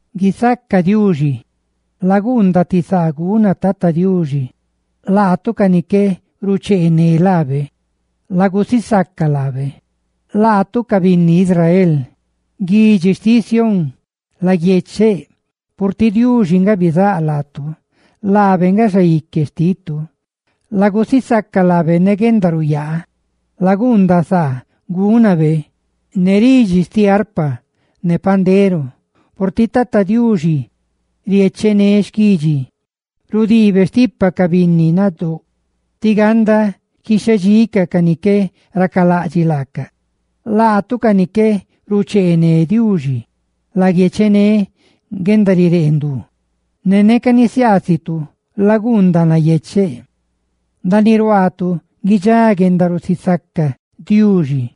¡Guisaca Diuxi! Laguundaꞌ ti saa guna Tata Diuxi; ca ni qué rucheené laabe, lagusisaca laabe. Laguiecheꞌ israelitacaꞌ, guidxi xtiꞌ Sión, purtiꞌ Diuxi nga bizáꞌ laatu ne laabe nga Xaique xtitu. Lagusisaca lábe ne guendaruyaa, laguundaꞌ saa gúnabe ne ridxi xtiꞌ arpa ne pandero. Purtiꞌ Tata Diuxi riechené xquidxi; rudiibe stipa ca binni nadóꞌ tí ganda quixhedxicaꞌ ca ni qué racalaꞌdxiꞌ laacaꞌ. Laatu ca ni qué rucheené Diuxi, laguiechené guendarireendú, ne neca nisiaasitu laguundaꞌ nayecheꞌ. Ndaaniꞌ ruaatu guidxá guendarusisaca Diuxi,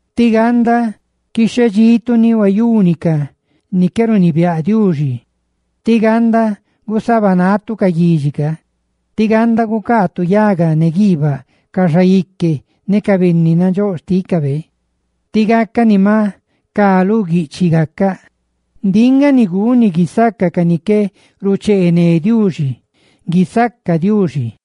tí ganda guquíxetu ni, ca ni qué runibiáꞌ Diuxi, tí ganda gusabanatu ca guidxi roꞌ ca, tí ganda gucaatu yaga ne guiibaꞌ ca xaique ne ca binni nandxóꞌ xtícabe, tí gacaꞌ ni maꞌ cá lu guiꞌchiꞌ gacaꞌ. ¡Ndiꞌ nga ni guni guisaca ca ni qué rucheené Diuxi! ¡Guisaca Diuxi!